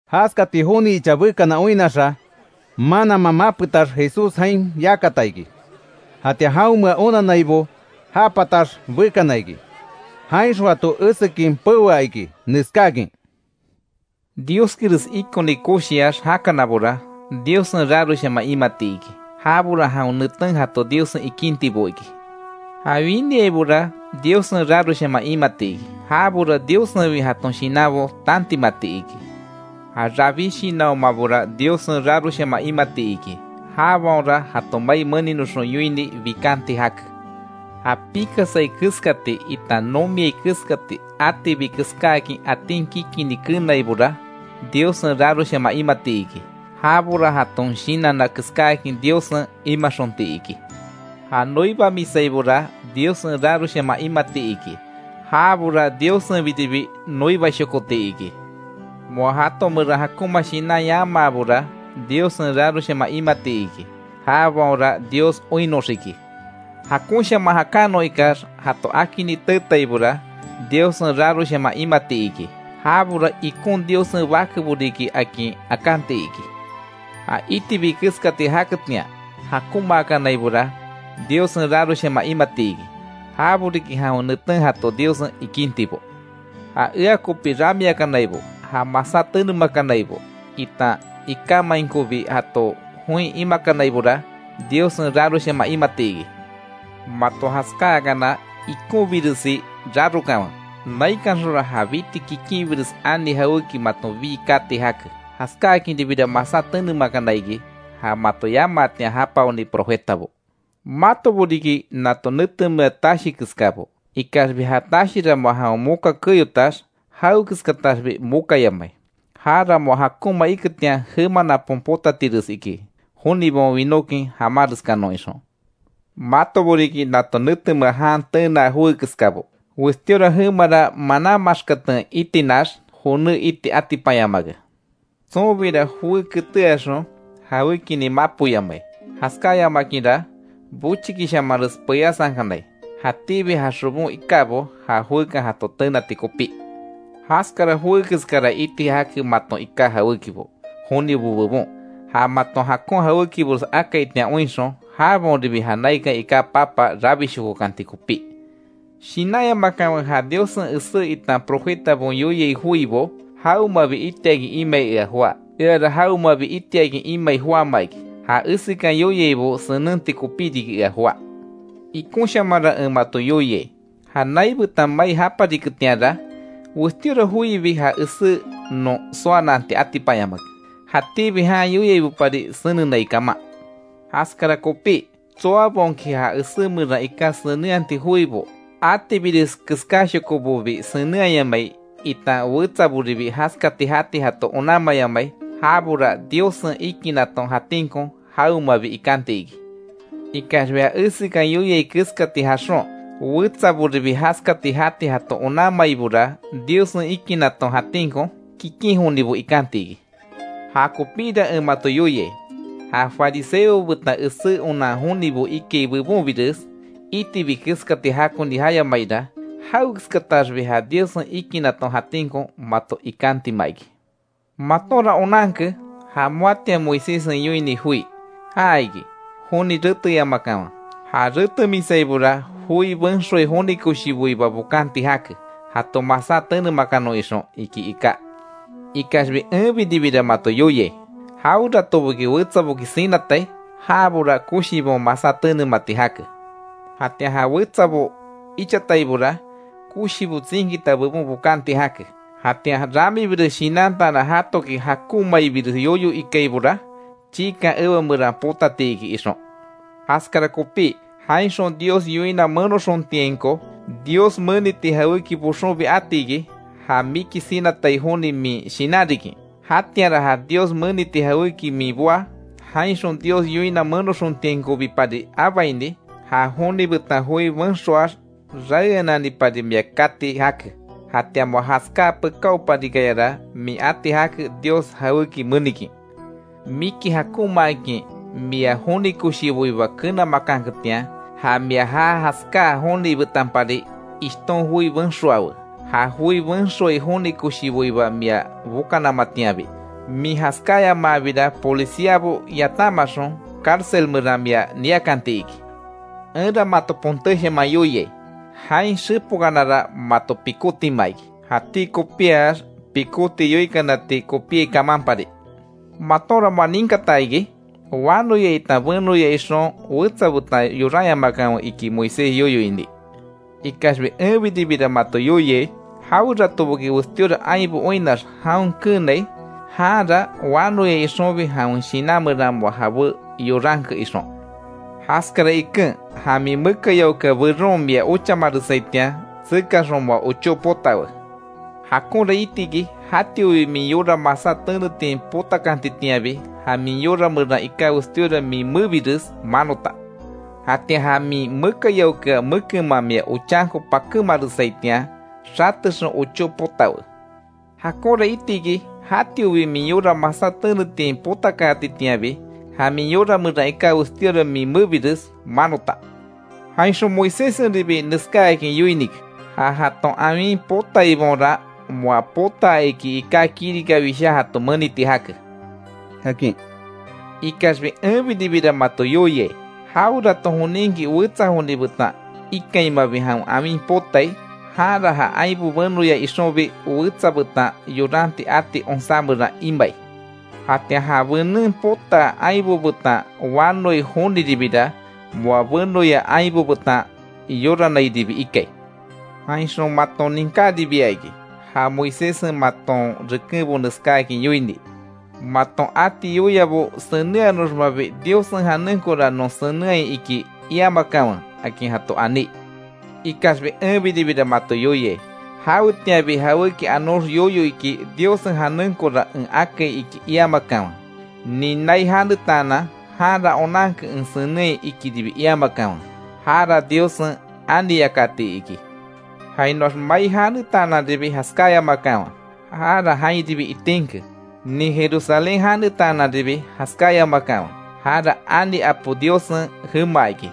Jaskati joni icha bekana oinnaxa, mananman mapetax Jesús jain yakata iki. Jatian jaonmea onannaibo ja patax bekana iki. Jainxon jato esekin peoa iki, neskáakin: “Dioskires ikoni koshiax jakanabora, Diossen raroshaman imati iki. Jabora jawen neten jato Diossen ikintibo iki. Ja winiaibora Diossen raroshaman imati iki. Jabora Diossenbi jaton shinanbo tantimati iki. Ja rabí shinanhomabora Diossen raroshaman imati iki. Jabaonra jato mai meninoxon yoini, bikanti jake. Ja pikasai keskati itan nomiai keskati, atibi keskáakin atin kikini keenaibora, Diossen raroshaman imati iki. Jabora jaton shinanna keskáakin Diossen imaxonti iki. Ja noibamisaibora, Diossen raroshaman imati iki. Jabora Diossenbiribi noibashokoti iki. Moa jato meran jakonma shinan yamaabora Diossen raroshaman imati iki. Jabaonra Dios oinnoxiki. Jakonshaman jakanon ikax jato akini teetaibora, Diossen raroshaman imati iki. Jabora ikon Diossen bakebo riki, akin akanti iki. Ja itibi keskati jaketian, jakonmaakanaibora, Diossen raroshaman imati iki. Jabo riki jawen neten jato Diossen ikintibo. Ja ea kopi ramiakanaibo, ja masá tenemakanaibo, itan ikámainkobi jato join imakanaibora, Diossen raroshaman imati iki. Mato jaskáakana, ikonbiresi rarokanwe, naikanxonra ja biti kikinbires ani jawéki maton bii kati jake. Jaskáakinribira masá tenemakana iki, ja mato yamaatian japaoni profetabo. Matobo riki nato netemea tashi keskabo. Ikaxbi ja tashira moa jawen moka keyotax, jawekeskataxbi mokayamai, jara moa jakonma iketian jema napon potatires iki jonibaon winókin jamáreskanon ixon. Matobo riki nato nete jan tenaa joé keskabo. Westíora jemara manan maxkaten itinax, joné iti atipanyamake. Tsonbira joé keteaxon jawékinin mapoyamai. Jaskáyamakinra, bochikishamanres peyasankanai, jatíbi ja xobon ikábo ja joekan jato tenati kopí. Jaskara joé keskara iti jake maton iká jawékibo, jonibo bebon. Ja maton jakon jawékibores akaitian oinxon, jabaonribi ja naikan iká Papa rabishokokanti kopí. Shinanyamakanwe, ja Diossen esé itan profetabaon yoiai joibo, jawemabi itiakin imai ea joá. Eara jawemabi itiakin imai joáma iki. Ja esekan yoiaibo senenti kopí riki ea joá. Ikonshamanra en mato yoiai: Ja nai betan mai japariketianra, westíora joibi ja esé non soananti atipanyamake, jatíbi jan yoiaibopari senenai kaman. Jaskara kopí, tsoabaonki ja esé meran iká senenhati joibo, atibires keskáshokobobi senenhayamai itan wetsaboribi jaskati jati jato onanmayamai, jabora Diossen ikinaton jatinko jawemabi ikanti iki. Ikaxbi ja esekan yoiai keskati jaxon, wetsaboribi jaskati jati jato onanmaibora, Diossen ikinaton jatinko kikin jonibo ikanti iki. Jakopíra en mato yoiai, ja fariseobo betan esé onan jonibo ikai bebonbires itibi keskati jakoni jayamaira, jawekeskataxbi ja Diossen ikinaton jatinko mato ikantima iki. Matonra onanke, ja moatian Moiséssen yoini joi, ja iki: ‘Joni reteyamakanwe. Ja retemisaibora joi benxoai joni koshiboiba bokanti jake, jato masá tenemakanon ixon’, iki iká. Ikaxbi enbiribira mato yoiai: Jaweratoboki wetsaboki sinatai, jabora koshibaon, masá tenemati jake. Jatian ja wetsabo ichataibora, koshibo tsinkita bebon bokanti jake. Jatian ramibires shinantaanan jatoki jakonmaibires yoyo ikaibora, chiikan ewa meran potati iki ixon. Jaskara kopí, jainxon Dios yoina menoxontiainko, Dios meniti jawéki boxonbi atiki, ja miki sinatai joni min shinanrikin. Jatianra ja Dios meniti jawéki min boá, jainxon Dios yoina menoxontiainkobipari abaini, ja joni betan joi benxoax raeananipari mia kati jake. Jatian moa jaskáa pekáoparikayara, min ati jake Dios jawéki menikin. Miki jakonmaakin mia joni koshiboiba kenamakanketian, ja mia ja jaskáa joni betanpari ishton joi benxoawe. Ja joi benxoai joni koshiboiba mia bokanamatianbi. Min jaskáyamaabira, policiabo yatanmaxon cárcel meran mia niakanti iki. Enra mato pontéshaman yoiai: Jain xepokanara mato pikótima iki, jatí kopíax pikóti yoikanati kopíai kamanpari. Matonra moa ninkata iki: ‘Wanoya itan benoya ixon, wetsa betan yoranyamakanwe’, iki Moisés yoyo ini. Ikaxbi enbiribira mato yoiai: Jaweratoboki westíora ainbo oinnax jaon keenai, janra wanoya ixonbi, jawen shinan meran moa jabé yoranke ixon. Jaskara iken, ja min mekayaokea beron mia ochamaresaitian, tsekaxon moa ochó potawe. Jakonra itiki jatiobi min yora, masá tenetian potakantitianbi, ja min yora meran iká westíora min mebires manota. Jatian ja min mekayaokea mekenman mia ochanko pakémaresaitian, xatexon ochó potawe. Jakonra itiki jatiobi min yora, masá tenetian potaakatitianbi, ja min yora meran iká westíora min mebires manota. Jainxon Moiséssenribi neskáakin yoinike: ‘Ja jaton awin potaibaonra, moa potaa iki iká kirika wishá jato meniti jake’, akin. Ikaxbi enbiribira mato yoiai: Jawerato joninki wetsa joni betan ikainmabi jawen awin potai, janra ja ainbo benoya ixonbi wetsa betan yoranti ati onsá meran imai. Jatian ja benen potaa ainbo betan wanoai joniribira, moa benoya ainbo betan yoranairibi ikai. Jainxon maton ninkáribia iki, ja Moiséssen maton rekenbo neskáakin yoini: ‘Maton ati yoiabo senenhanoxmabi Diossen janenkora non senenhai iki iamakanwe’, akin jato aní. Ikaxbi enbiribira mato yoiai: Jawetianbi jawéki anox yoyo iki, Diossen janenkora en akai iki iamakanwe. Nin nai janetaanan, janra onanke en senenhai, ikiribi iamakanwe, jara Diossen ani yakati iki. Jainoax mai janetaananribi jaskáyamakanwe, jara jainribi itinke. Nin Jerusalén janetaananribi jaskáyamakanwe. Jara ani Apo Diossen jema iki.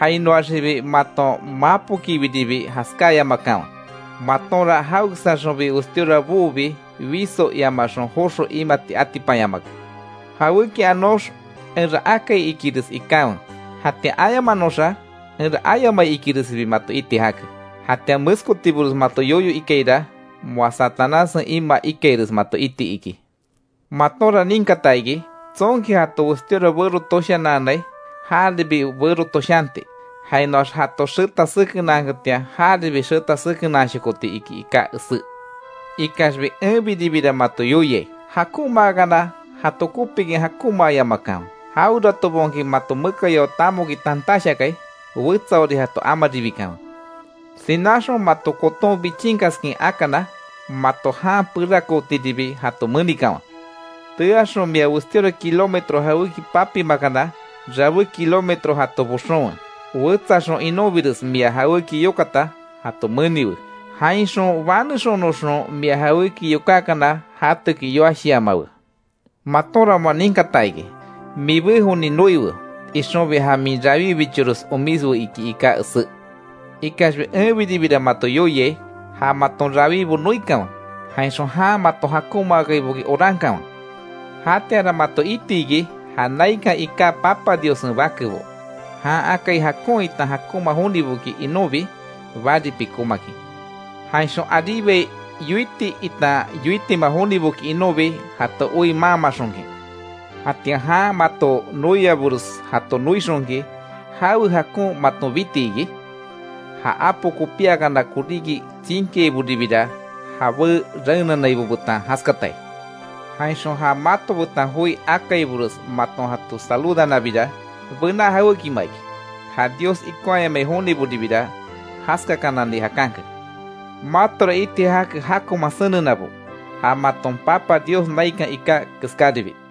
Jainoaxibi maton mapokibiribi jaskáyamakanwe, matonra jawekeskaaxonbi westíora boobi, wiso iamaxon joxo imati atipanyamake. Jawéki anox: ‘Enra akai’, ikires ikanwe; jatian ayamanoxa: ‘Enra ayamai’, ikiresibi mato iti jake. Jatian meskotibores mato yoyo ikaira, moa Satanássen imaa ikaires mato iti iki. Matonra ninkata iki: ‘Tsonki jato westíora bero toshananai, jaribi westíora bero toshanti; jainoax jato xeta sekenaanketian jaribi xeta sekenaanshokoti’, iki iká esé. Ikaxbi, enbiribira mato yoiai: Jakonmaakana jato kopikin jakonmaayamakanwe, jaweratobaonki mato mekayao tamoki tantash akai, wetsaori jato amaribikanwe. Sináaxon mato koton bichinkaskin akana, mato jan perakootiribi jato menikanwe. Teaxon mia westíora kilómetro jawéki papimakana, rabé kilómetro jato boxonwe. Wetsaxon inonbires mia jawéki yokata, jato meniwe. Jainxon banexonoxon mia jawéki yokákana jatoki yoashiamawe. Matonra moa ninkata iki: ‘Mibé joni noiwe, ixonbi ja min rawíbichores omiswe’, iki iká esé. Ikaxbi enbiribira mato yoiai: Ja maton rawíbo noikanwe, jainxon jan mato jakonmaaiboki orankanwe. Jatianra mato itiki ja naikan iká Papa Diossen bakebo. Jan akai jakon itan jakonma joniboki inonbi bari pikómakin. Jainxon aríbai yoiti itan yoitima joniboki inonbi jato oi maanmaxonkin. Jatian jan mato noiabores jato noixonki, ¿Jawe jakon maton biti iki? Ja apo kopíakana koríki tsinkiaiboribira jabé raenanaibo betan jaskatai. Jainxon ja mato betan joi akaibores maton jato saludanabira, bená jawékima iki, ja Dios ikonhayamai jonibobira jaskakanani jakanke. Matora iti jake jakonman senenabo, ja maton Papa Dios naikan iká keskaribi.